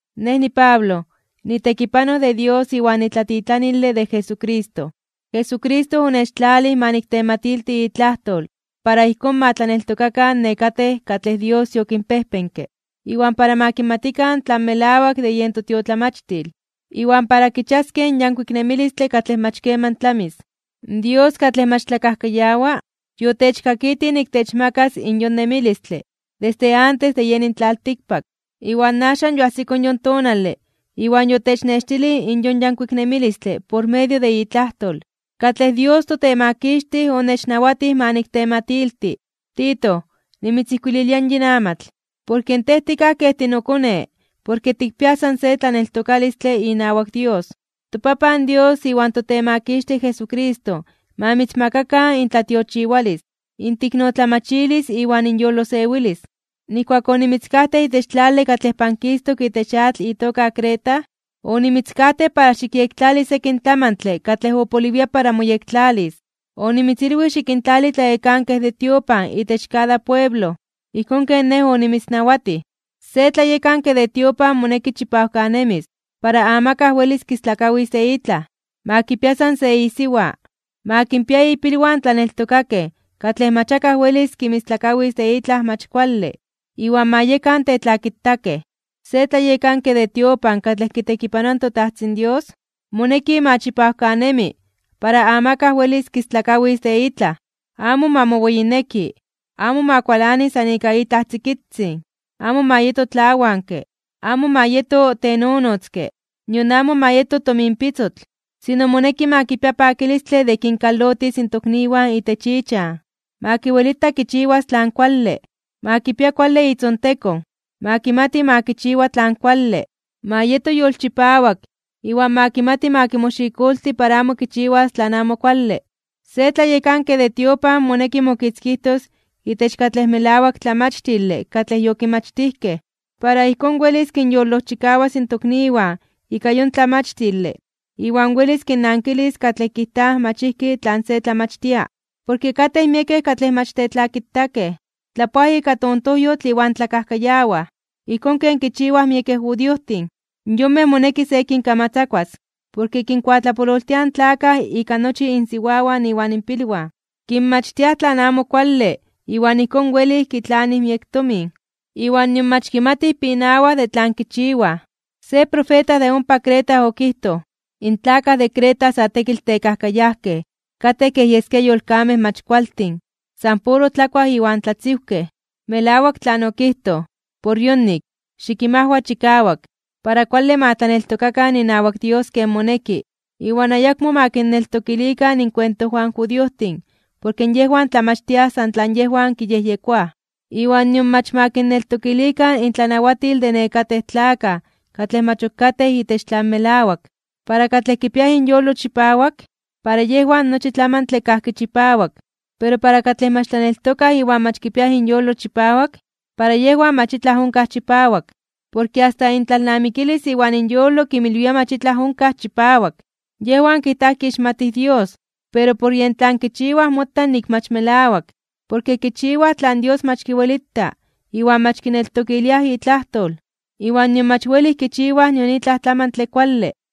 Nej niPablo, nitekipanoj de Dios iwan nitlatitlanile de Jesucristo. Jesucristo onechtlalij ma niktematilti itlajtol para ijkón ma tlaneltokakan nekatej katlej Dios yokinpejpenke, iwan para ma kimatikan tlan melawak de yen totiotlamachtil, iwan para kichiaskej in yankuik nemilistle katlej mach keman tlamis. Dios, katlej mach tlakajkayawa, yotechkakitij nik techmakas in yon nemilistle desde antes de yeni in tlaltikpak. Iwan axan yoajsiko yon tonale iwan yotechnextilij in yon yankuik nemilistle por medio de itlajtol, katlej Dios toTemakixtij onechnawatij ma niktematilti. Tito, nimitzijkuililia yin amatl, porke tej tikaj kej tinokone porke tikpiaj san se tlaneltokalistle inawak Dios. ToPapan Dios iwan toTemakixtij Jesucristo ma mitzmakakan intlatiochiwalis, inteiknotlamachilis iwan inyolosewilis. Nijkuak onimitzkajtej itech tlale katlej pankistok itech atl itoka Creta, onimitzkajtej para xikyektlali sekin tlamantle katlej opoliwia para moyektlalis. Onimitzilwij xikintlali tlayekankej de tiopan itech kada pueblo, ijkón ken nej onimitznawatij. Se tlayekanke de tiopan moneki chipawkanemis para amakaj welis kistlakawis de itlaj. Ma kipia san se isiwa. Ma kinpia ipilwan tlaneltokakej katlej mach akaj welis kinmistlakawis de itlaj mach kuale, iwan ma yekan tetlakitakej. Se tlayekanke de tiopan katlej kitekipanoa in toTajtzin Dios, moneki ma chipawkanemi para amakaj welis kistlakawis de itlaj. Amo ma moweyineki, amo ma kualani san ika itlaj tzikitzin, amo ma yeto tlawanke, amo ma yeto tenonotzke, nion amo ma yeto tominpitzotl. Sino, moneki ma kipia pakilistle de kinkalotis in tokniwan itech ichan, ma kiwelita kichiwas tlan kuale, ma kipia kuale itzontekon, ma kimati ma kichiwa tlan kuale, ma yeto yolchipawak iwan ma kimati ma kimoxikolti para amo kichiwas tlan amo kuale. Se tlayekanke de tiopan moneki mokitzkijtos itech katlej melawak tlamachtile katlej yokimachtijkej. Para ijkón welis kinyolojchikawas in tokniwan ika yon tlamachtile iwan welis kinnankilis katlej kijtaj mach ijki tlan se tlamachtia. Porke katej miekej katlej mach tetlakitakej, tlapoaj ika tontojyotl iwan tlakajkayawaj. Ijkón ken kichiwaj miekej judiojtin. Yonmej moneki se kinkamatzakuas, porke kinkuatlapololtiaj in tlakaj ika nochi insiwawan iwan inpilwan, kinmachtiaj tlan amo kuale iwan ijkón welij kitlanij miek tomin, iwan nion mach kimatij pinawaj de tlan kichiwaj. Se profeta de ompa Creta okijtoj: “In tlakaj de Creta sa tekitl tekajkayajkej, katej kej yeskia yolkamej mach kualtin, san puro tlakuaj iwan tlatziwkej.” Melawak tlan okijtoj. Por yonik, xikinmajwa chikawak, para kuale ma tlaneltokakan inawak Dios ken moneki iwan ayakmo ma kinneltokilikan inkuentojwan in judiojtin porke yejwan tlamachtiaj san tlan yejwan kiyejyekoaj, iwan nion mach ma kinneltokilikan intlanawatil de nekatej tlakaj katlej mach ok katej itech tlan melawak. Para katlej kipiaj inyolo chipawak, para yejwan nochi tlamantle kajki chipawak. Pero para katlej mach tlaneltokaj iwan mach kipiaj inyolo chipawak, para yejwan mach itlaj onkaj chipawak. Porke asta intlalnamikilis iwan inyolo kinmilwia mach itlaj onkaj chipawak. Yejwan kijtaj kixmatij in Dios, pero por yen tlan kichiwaj mota nik mach melawak. Porke kichiwaj tlan Dios mach kiwelita iwan mach kineltokiliaj itlajtol, iwan nion mach welij kichiwaj nion itlaj tlamantle kuale.